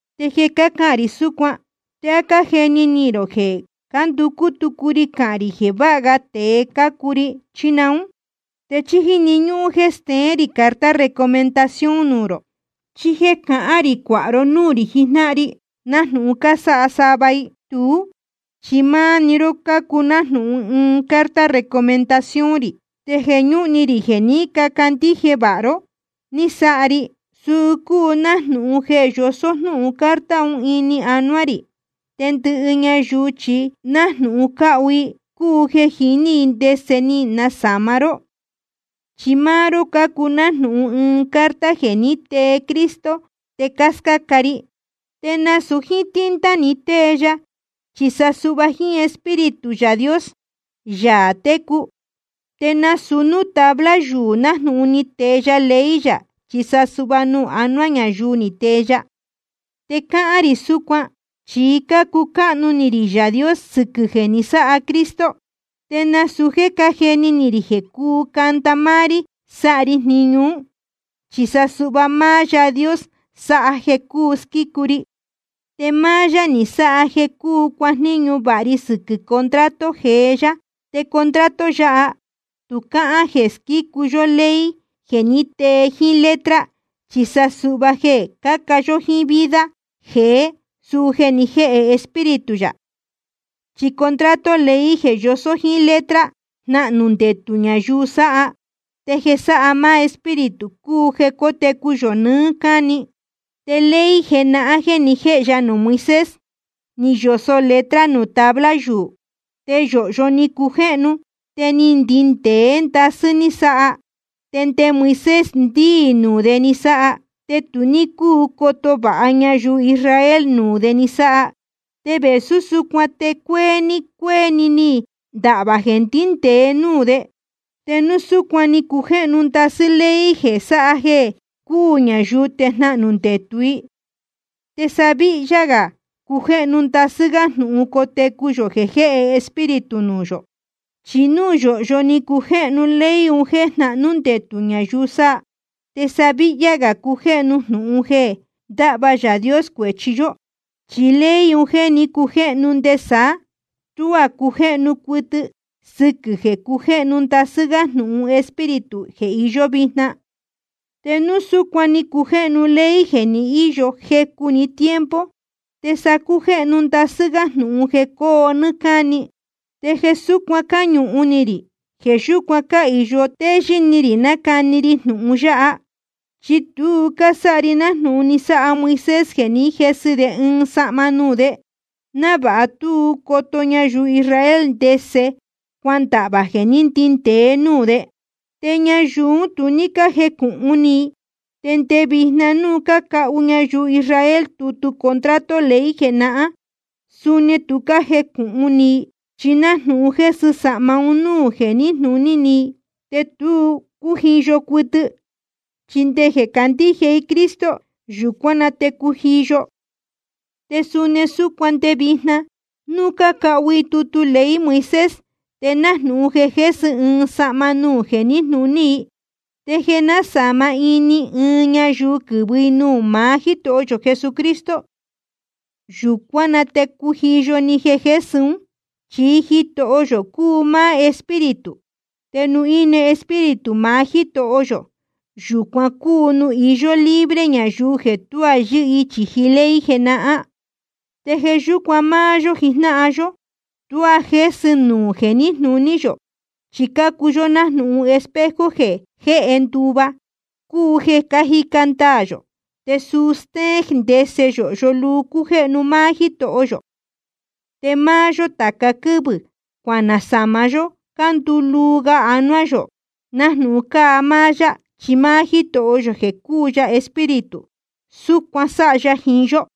Te jeē cácahān rī súcuan, ¿te á cájeni ni rō jeē cánducú tucu ri cahān rī jeē váha ga tēe cácuu ri, chí naún? ¿Te chí jíni ñúhún jéē steén rī carta recomendación nuū rō, chí jéē cacán rī cuāha ró núū rī jijnáhan ri, nájnūhun cásáha sava i? Tuú chi máá‑ni ró cácuu nájnūhun ɨɨn carta recomendación rī. Te jeē ñúhun ni rī jeē ní cacandíje vāha ró ni sáha ri, suu cúu nájnūhun jeē yosó jnúhun carta un ini anuá rī. Te ndɨhɨ ñayuu chi nájnūhun cáhu i, cúu jeē jiní i ndese ni nasāma ró. Chi máá ró cácuu nájnūhun ɨɨn carta jeē ní tee Cristo te cáscáca ri. Te nasūu jíín tinta ni tee ya, chi sa suhva jíín Espíritu Yaā Dios, Yaā técu. Te nasūu núū tabla yuū nájnūhun ni tee ya ley yā, chi sa suhva nuū anuá ñayuu ni tee ya. Te cácahān rī súcuan, chi cácucáhnu ni rī Yaā Dios sɨquɨ̄ jeē ni sáha Cristo. Te nasūu jéē cájeni ni rī jeē cúu canda máá rí sáha ri jniñu ún. Chi sa suhva máá Yaā Dios sáha jeē cuu squícu ri. Te máá yá ni sáha jeē cuu cuajníñu vāha ri sɨquɨ̄ contrato jeé yá. Te contrato yáha tu cáhán jeē squícu yó ley jeē ní tee jíín letra, chi sa suhva jeē caca yó jíín vida jeé, suu jeē ni jéhe Espíritu yā. Chi contrato ley jeē yosó jíín letra, jnahnū ndetū ñayuu sáha. Te jeē sáha máá Espíritu cúu jeē cótecu yō nɨɨ́ cáni. Te ley jenahán jeē ni jéhe ya nuū Moisés, ni yosō letra nuū tabla yuū. Te yōhyo ni cujéhnu, te ni ndindēé ndasɨ́ ni sáha, te nde Moisés ndíī nuū de ni sáha. Te tu ní cúu coto vāha ñayuu Israel nuū de ni sáha. Te vēsú súcuan te cuéé‑ni cuéé‑ni ni ndahvā jeē ndíndēe núū de. Te núu súcuan ni cujéhnu ndasɨ́ ley jeē sáha jeē cuu ñayuu te jnahnū ndetū i, te sa víhyá gā cujéhnu ndasɨ́ gá jnūhun cotecu yō jeē jéhe Espíritu nuū yō. Chi núu yōhyo ni cujéhnu ley un jéē jnahnú ndetū ñayuu sáha, te sa víhyá gā cujéhnu jnūhun jeē ndáhva Yaā Dios cuēchi yó. Chi ley un jéē ní cujéhnu nde saá, tuá cujéhnu cuɨtɨ, sɨquɨ̄ jeē cujéhnu ndasɨ́ gá jnūhun Espíritu jeē iyó vijna. Te núu súcuan ni cujéhnu ley jeē ni íyo jecu‑ni tiempo, te sa cujéhnu ndasɨ́ gá jnūhun jeē coo nɨ́ɨ́ cáni. Te jeē súcuan cáñuhun ni rī, jeē yúcuan cáhīyo téyɨ́ ni rī nácani ri jnūhun yáha. Chi tu cásáha ri nájnūhun ni sáha Moisés jeē ní jesɨ de ɨɨn sahma nuū de, návāha tú coto ñayuu Israel ndese cuandahvā jeē ní ndindēe núū de. Te ñayuu ún tu ní cájecūhun ni i. Te nde vijna núu cácahu ñayuu Israel tutu contrato ley jenahán, suni tu cájecūhun ni i, chi nájnūhun jésɨ sahma un núū jeē níjnūní i, te tu cújiyo cuɨtɨ. Chi nde jeē candíje i Cristo, yūcuán na te cujiyo. Te suni súcuan nde vijna núu cácahu i tutu ley Moisés, te nájnūhun jeē jésɨ ɨɨn sahma nuū jeē níjnūní i. Te jeē násāma ini ɨɨn ñayuu quɨ̄vɨ i nuū maá Jítoho yō Cristo, yūcuán na te cújiyo‑ni jeē jésɨ ún. Chi Jitoho yō cúu máá Espíritu. Te nuū íne Espíritu maá Jítoho yō, yūcuan cúu nuū iyó libre ñayuu jeē tuá yɨ́hɨ i chīji ley jenahán. Te jeē yúcuan máá yó jijnáhan yó, tuá jésɨ nuū jeē níjnūní yō. Chi cácuu yó nájnūhun espejo jeē jéhe nduva, cúu jeē cájica ndaā yō te suu stéén ndese yōhyo luu cújéhnu máá Jítoho yō. Te máá yó tāca quɨ́vɨ̄ cuanasāma yó cuanduu luu ga anuá yō nájnūhun cáa máá yá. Chi máá Jítoho yō jeē cúu ya Espíritu, súcuan sáha ya jiín yó.